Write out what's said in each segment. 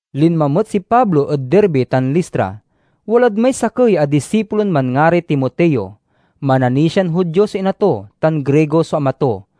Linma met si Pablo ed Derbe tan Listra. Walad may sakey a disipulon manngaray Timoteo; mananisian Judio so ina to, tan Grigo so ama to.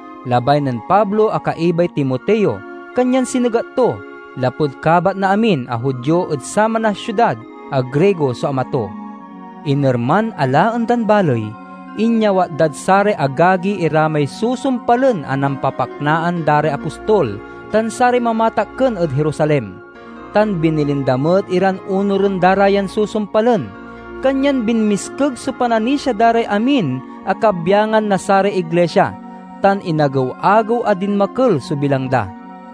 Labay nen Pablo a kaibay Timoteo, kanyan sinegat to, lapud kabat na amin a Judio ed saman a siudad a Grigo so ama to. Inerman a laen dan baley, inyawat dad saray agagi ira may susumpalen a nampapaknaan da ray apostol tan saray mamatakken ed Jerusalem, tan binilin da met iran onuren da ra yan susumpalen. Kanyan binmiskeg so pananisia da ray amin a kabyangan na saray iglisia, tan inagew-agew a dinmakel so bilang da.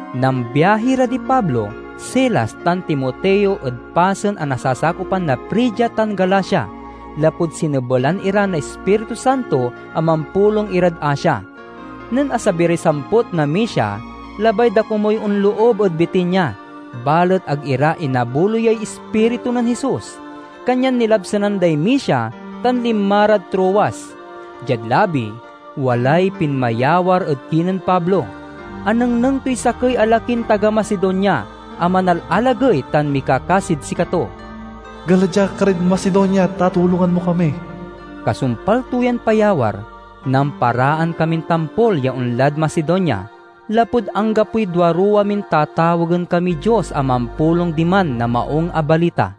Nambiahi ra di Pablo, Silas, tan Timoteo ed pasen a nasasakopan na Frigia tan Galacia, lapud sinebelan ira na Ispiritu Santo a mampulong irad Asia. Nen asabi ray samput na Misia, labay da komuy onloob ed Bitinia. Balet ag ira inabuloyay Ispiritu nen Jesus. Kanyan nilabsanan day Misia, tan linma rad Troas. Diad labi, walay pinmayawar ed kinen Pablo. Anengneng toy sakey a lakin taga Macedonia, a manalalagey tan mikakasid sikato, "Gala dia karid Macedonia, ta tulongan mo kami." Kasumpal to yan payawar, namparaan kamin tampol ya onlad Macedonia, lapud anggapoy duaruwa min tatawagen kamiy Dios a mampulong diman na Maung a Balita.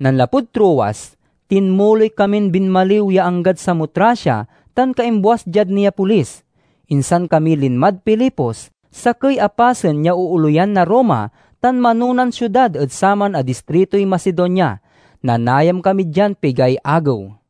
Nanlapud Troas, tinmuloy kamin binmaliw ya anggad Samotracia, tan kaimbuas diad Neapolis. Insan kami linmad Filipos, sakey a pasen ya ooleyan na Roma tan manonan siudad ed saman a distritoy Macedonia. Nanayam kami dian pigay agew.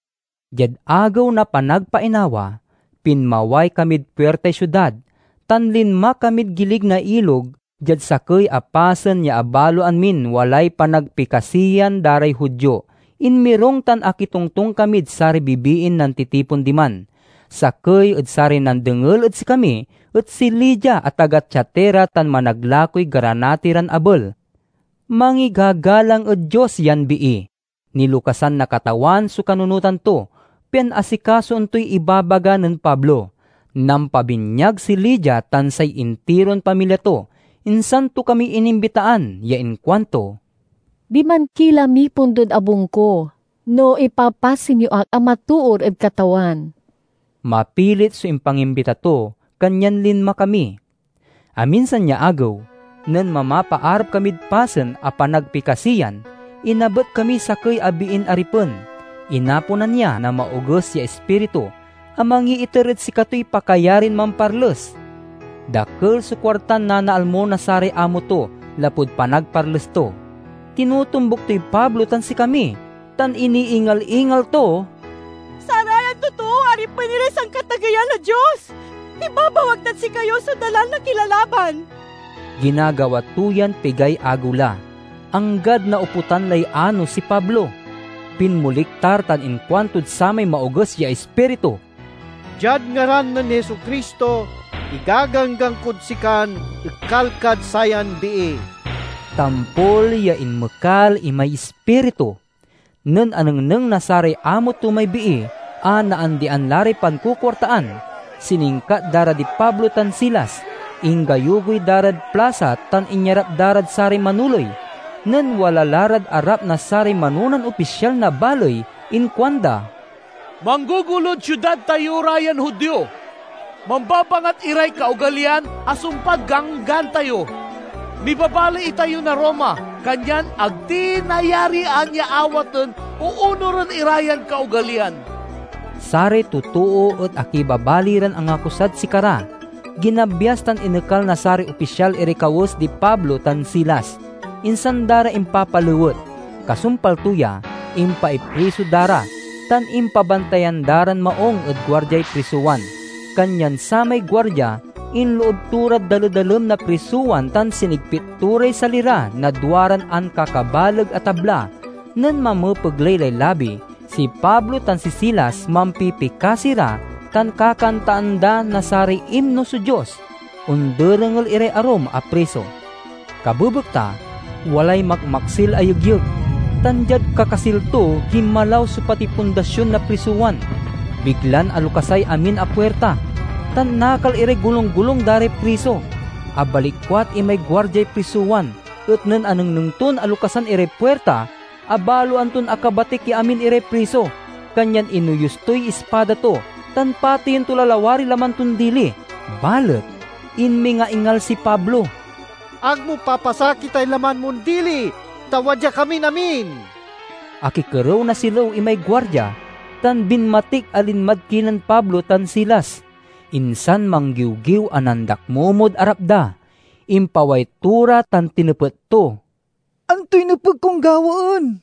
Diad Agew na Panagpainawa, pinmaway kamid puirtay siudad, tan linma kamid gilig na ilog diad sakey a pasen ya abaloan min walay panagpikasiyan da ray Judio. Inmirung tan akitongtong kamid saray bibiin nantitipon diman. Sakey ed saray nandengel ed sikami et si Lydia a taga Tiatira tan managlakoy granati ran abel. Mangigagalang ed Dios yan bii. Nilokasan na Katawan so kanunotan to, pian asikasoen toy ibabaga nen Pablo. Nampabinyag si Lydia tan say intiron pamilya to. Insan to kami inimbitaan ya inkuanto, "Diman ki la mipundod abung ko, no ipapasen yo ak a matoor ed Katawan." Mapilit so impangimbita to, kanyan linma kami. Aminsan ya agew, nen mamapaarap kamid pasen a panagpikasiyan, inabet kamiy sakey a biin aripen. Inaponan ya na maoges ya ispiritu, a mangiiter ed sikatoy pakayarin mamparles. Dakel so kuartan nanaalmo na saray amo to lapud panagparles to. Tinotombuk toy Pablo tan sikami, tan iniingal-ingal to, "Sarayan totoo aripen iray Sankatageyan a Dios! Ibabawag dad sikayo so dalan na kilalaban!" Ginagawa to yan pigay agew la, anggad naoputan lay anos si Pablo. Pinmoliktar tan inkuantod samay maoges ya ispiritu, "Diad ngaran nen Jesu-Cristo, igaganggan kod sikan ekal kad sayan bii!" Tampol ya inmekal imay ispiritu. Nen anengneng na saray amo to may bii a naandian la ray pankukuartaan, siningkat da ra di Pablo tan Silas, inggayugoy da rad plasa tan inyarap da rad saray manoley. Nen wala la rad arap na saray manonan opisyal na baley inkuanda, "Manggogolod siudad tayo ra yan Judio. Mambabangat iray kaogaliyan a sumpad ganggan tayo. Mibabaley itayo na Roma, kanyan ag ti nayarian ya awaten o onuren ira yan kaogaliyan!" Saray totoo et akibabali ran angakusad sikara. Ginabyas tan inekal na saray opisyal iray kawes di Pablo tan Silas, insan da ra impapalewet. Kasumpal to ya, impaipriso da ra, tan impabantayan da ran maung ed guardiay prisowan. Kanyan samay guardia inloob to rad daledalem na prisowan tan sinigpit to ray sali ra na duaran ankakabaleg a tabla. Nen mamepegley lay labi, si Pablo tan si Silas mampipikasi ra tan kakantaan da na saray imno so Dios. Onderengel iray arum a priso. Kabebekta walay makmaksil a yegyeg, tan diad kakasil to ginmalaw so pati pundasion na prisowan. Biglan alokasay amin a puirta, tan nakal iray golunggolung da ray priso. Abalikwat imay guardiay prisowan, et nen anengneng ton alokasan iray puirta, abaloan ton akabatik ya amin iray priso. Kanyan inoyus toy ispada to, tan pateyen to la lawariy laman ton dili. Balet inmingaingal si Pablo, "Ag mo papasakitay laman mon dili, ta wadya kamin amin!" Akikerew na silew imay guardia, tan binmatik a linmad kinen Pablo tan Silas, insan manggiwgiw a nandakmomod arap da. Impaway to ra tan tinepet to, "Antoy nepeg kon gawaen,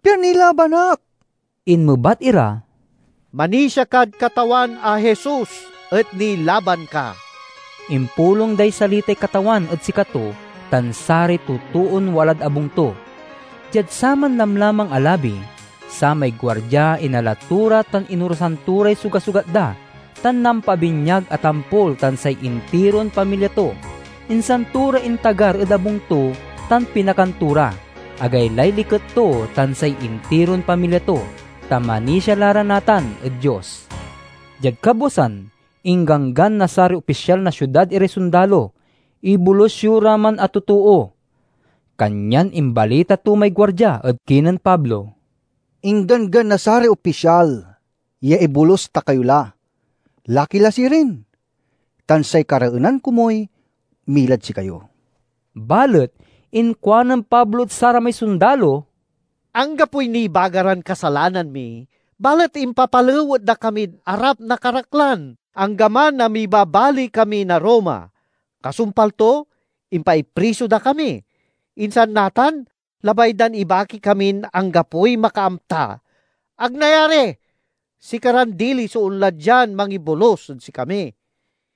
pian nilaban ak?" Inmebat ira, "Manisia kad Katawan a Jesus, et nilaban ka." Impulong day salitay Katawan ed sikato tan saray totoon walad abung to. Diad saman lamlamang a labi, samay guardia inala to ra tan inorasan to ray sugasugat da, tan nampabinyag a tampol tan say intiron pamilya to. Insan to ra intagar ed abung to tan pinakan to ra. Agaylay liket to tan say intiron pamilya to, ta manisia la ra natan ed Dios. Diad kabwasan, ingganggan na saray opisyal na siudad iray sondalo, "Ibolus yo ra man a totoo." Kanyan imbalita to may guardia ed kinen Pablo, "Ingganggan na saray opisyal ya ibolus ta kayo la. Laki la sirin, tan say kareenan komuy milad sikayo." Balet inkuanen Pablo ed saramay sondalo, "Anggapoy nibaga ran kasalanan mi, balet impapalewet da kamid arap na karaklan, anggaman a mibabaley kami na Roma. Kasumpal to, impaipriso da kami. Insan natan, labay dan ibaki kamin anggapoy makaamta. Ag nayari! Sikaran dili so onla dian mangibolus ed sikami."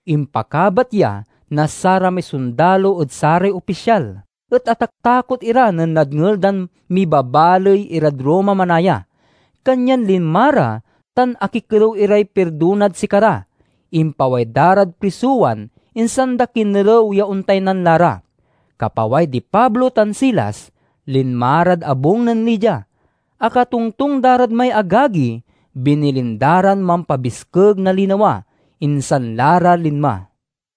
Impakabat ya na saramay sondalo ed saray opisyal et ataktakot ira nen nadngel dan mibabaley irad Roma manaya. Kanyan linma ra, tan akikerew iray pirdonad sikara. Impaway da rad prisowan, insan da kinerew ya ontaynan la ra. Kapaway di Pablo tan Silas, linma rad abung nen Lydia. Akatongtong da rad may agagi, binilin da ran mampabiskeg na linawa, insan la ra linma.